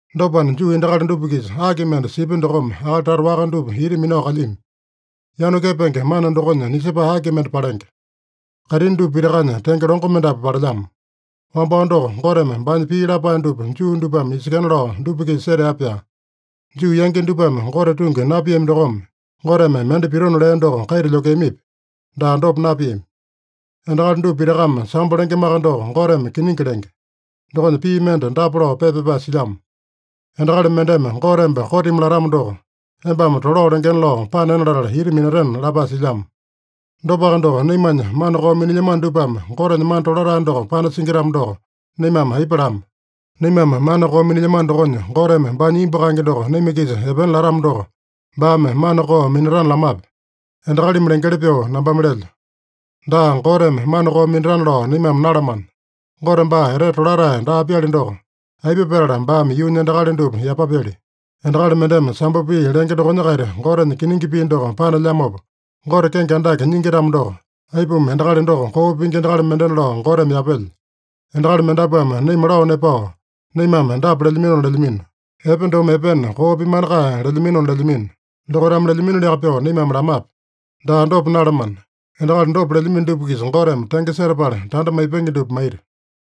Dopana, Juu endakali dupa-kisa aki mende sipya dokome akali tata waka dupa ita minao kalyami? Yanu kepenge mana dokonya nisepae aki mende palenge? Kaitini dupa pitakanya tenge longo mendapu palelyamo. Wambao doko, Goteme baanya pii lapae dupa Juu dupame isekena lao dupa-kisa setea-pyaa. Juu yangi dupame Gote tungi napiami dokome, Goteme mende pitona lea doko kaita lyokeamipi? Daa, dopa napiami! Endakali dupa pitakame sambo lengemaka doko, Goteme kiningi lenge. Dokonya pii mende dapa lao pepa pyapae silyamo: “Endakali mendeme Gote emba kotimi latamo doko, embame tolao lengena lao panena latala ita minatena” lapae silyamo. Dopaka doko, naimanya mana koo minilyamano dupame Gotenya mana tolatae doko panasingi-tamo doko, naimame aipa lama? Naimame mana koo minilyamano dokonya, Goteme baanya imbu kaenge doko naima-kisa epena latamo doko, baame mana koo minatana lamape? (Endakalimi lengeli pyoo nambame lelyo.) Daa, Goteme mana koo minatana lao naimame nalamana. Gote baa etete tolatae daa-pyali doko, aipa petala baame yuunya endakali dupa yapapyali? Endakali mendeme sambo pii lenge dokonya-kaita Gotenya kiningi pii doko panelyamopa Gote kenge andake nyingi-tamo doko, aipuma endakali doko koo pingi endakali mendena lao Goteme yapelya? Endakali mendapuame naima lao nepao, naimame dapa lelyaminona lelyamino: “Epe domo epena, koo pimana kae” lelyaminona lelyamino. Dokaitame lelyaminoliaka pyoo naimame lamape? Daa, dopa nalamana. Endakali dopa lelyamino dupa-kisa Goteme tenge setapala tanda maipenge dupa maita.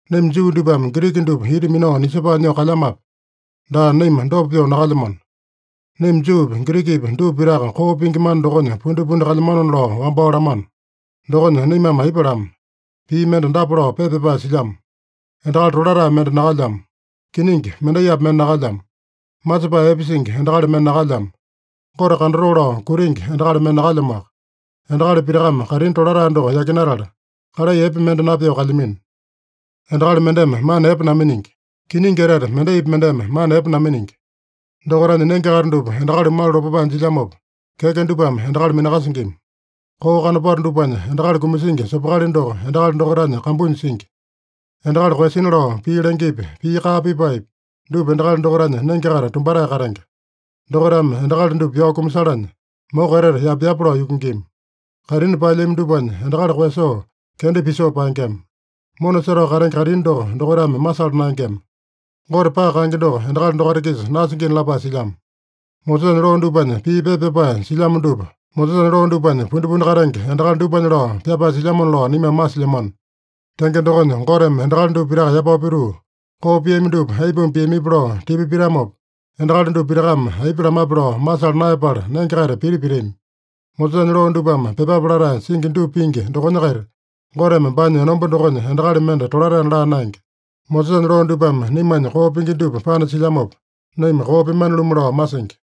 Naima Juu dupame Giriki dupa ita minao nisepae nyoo kalyamape? Daa, naima dopa pyoo nakalyamano. Naima Juupi, Girikipi dupa pitaka koo pingi mana dokonya pundipundi kalyamanona lao wambao lamano. Dokonya naimame aipa lama? Pii mende dapa lao pepa pyapae silyamo: “Endakali tolatae mende nakalyamo. Kiningi, mendaipi mende nakalyamo! Masepae epe singi endakali mende nakalyamo. Gote kandatoo lao kutingi endakali mende nakalyamoaka. Endakali pitakame kaitini tolatae doko yakinatala, kalai epe mende napyoo kalyamino. Endakali mendeme mana epe naminingi. Kiningi etete mendaipi mendeme mana epe naminingi! Dokaitanya nenge-kaita dupa endakali malu lopapae jilyamopa, keke dupame endakali minakasingima. Koo kanopato dupanya endakali kumasingi sopokali doko endakali dokaitanya kambunya singi. Endakali koeyasina lao pii lengepi, pii kaa pipaepi, dupa endakali dokaitanya nenge-kaita tumbatae katenge. Dokaitame endakali dupa pyao kumasalanya, moko etete yapa-yapa lao yukingima. Kaitini paelyami dupanya endakali koeyasoo, kenda pisoo paengema. Mona setao katenge kaitini doko dokaitame masala naengema. Gote paka kaenge doko endakali dokaita-kisa nasingina” lapae silyamo. Mosesanya loo dupanya pii pepa pyapae silyamo dupa Mosesanya loo dupanya pundipundi katenge endakali dupanya lao pyapae silyamona lao naimame masilyamano. Tenge dokonya, Goteme endakali dupa pitaka yapao pituu, koo piami dupa aipuma piamipi lao tipa pitamopa, endakali dupa pitakame aipa lamape lao masala naeyapala nenge-kaita piti pitami. Mosesanya loo dupame pyepape latae singi dupa pingi dokonya-kaita Goteme baanya enomba dokonya endakali mende tolataena laa naenge. Mosesanya loo dupame naimanya koo pingi dupa panasilyamopa, naima koo pyemane-lumu lao masingi.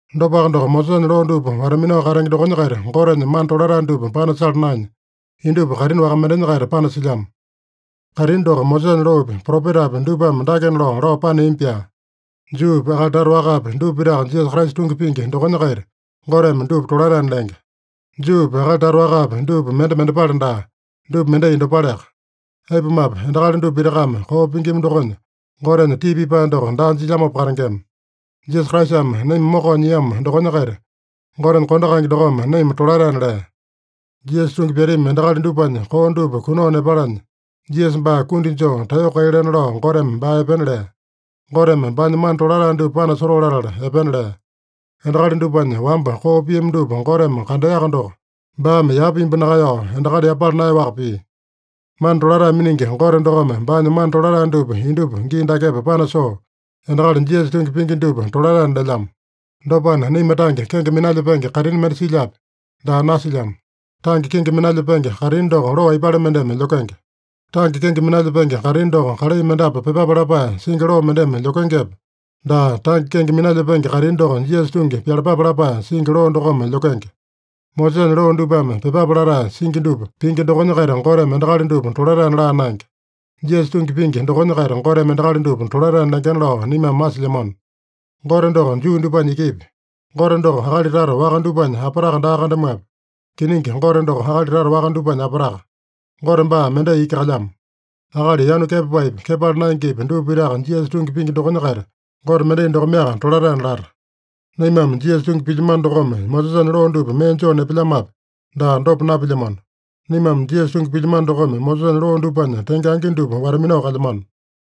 Dopaka doko, Mosesanya loo dupa wata-minao katenge dokonya-kaita Gotenya mana tolatae dupa panasala naenya, indupa kaitini waka mendenya-kaita panasilyamo. Kaitini doko Mosesanya loopi, propetapi dupame dakena lao, lao paneami-pyaa: Juupi, akali tata wakapi, dupa pitaka Jisasa Kraisa tungi pingi dokonya-kaita Goteme dupa tolataena lenge. Juupi, akali tata wakapi, dupa mende mendepale daa. Dupa mendai dopaleaka. Aipumape, endakali dupa pitakame koo pingima dokonya, Gotenya tii pipae doko daa jilyamopa katengema. Jisasa Kraisame naima mokao nyiamo dokonya-kaita Gotenya kondo kaenge dokome naima tolataena lea. Jisasa tungi pyatami endakali dupanya koo dupa kunao nepalanya, Jisasa baa kundi joo taeyoko kai lena lao Goteme baa epena lea. Goteme baanya mana tolatae dupa panasotoo latala epena lea. Endakali dupanya wamba koo piami dupa Goteme kandeaka doko, baame yapa imbu nakaeyao, endakali yapala naeyaowaka pia. Mana tolatae miningi Gote dokome baanya mana tolatae dupa indupa gii dakepa panasoo, endakali Jisasa tungi pingi dupa tolataena lelyamo. Dopana, naima tange kenge minalyepenge kaitini mende silyape? Daa, nasilyamo. Tange kenge minalyepenge kaitini doko loo aipale mendeme lyokenge? Tange kenge minalyepenge kaitini doko kalai mendapu pyepape lapae singi loo mendeme lyokengepe? Daa, tange kenge minalyepenge kaitini doko Jisasa tungi pyalapape lapae singi loo dokome lyokenge. Mosesanya loo dupame pyepape latae singi dupa pingi dokonya-kaita Goteme endakali dupa tolataena laa naenge. Jisasa tungi pingi dokonya-kaita Goteme endakali dupa tolataena lengena lao naimame masilyamano. Gote doko Juu dupanya ikipi? Gote doko akali tata waka dupanya apataka daa kandamuape? Kiningi, Gote doko akali tata waka dupanya apataka. Gote baa mendai iki kalyamo. Akali yanu kepapaepi, kepala naengepi, dupa pitaka Jisasa tungi pingi dokonya-kaita Gote mendai dokomeaka tolataena lata. Naimame Jisasa tungi pilyamano dokome Mosesanya loo dupa mee joo nepelyamape? Daa, dopa napilyamano. Naimame Jisasa tungi pilyamano dokome Mosesanya loo dupanya tenge angi dupa wata-minao kalyamano.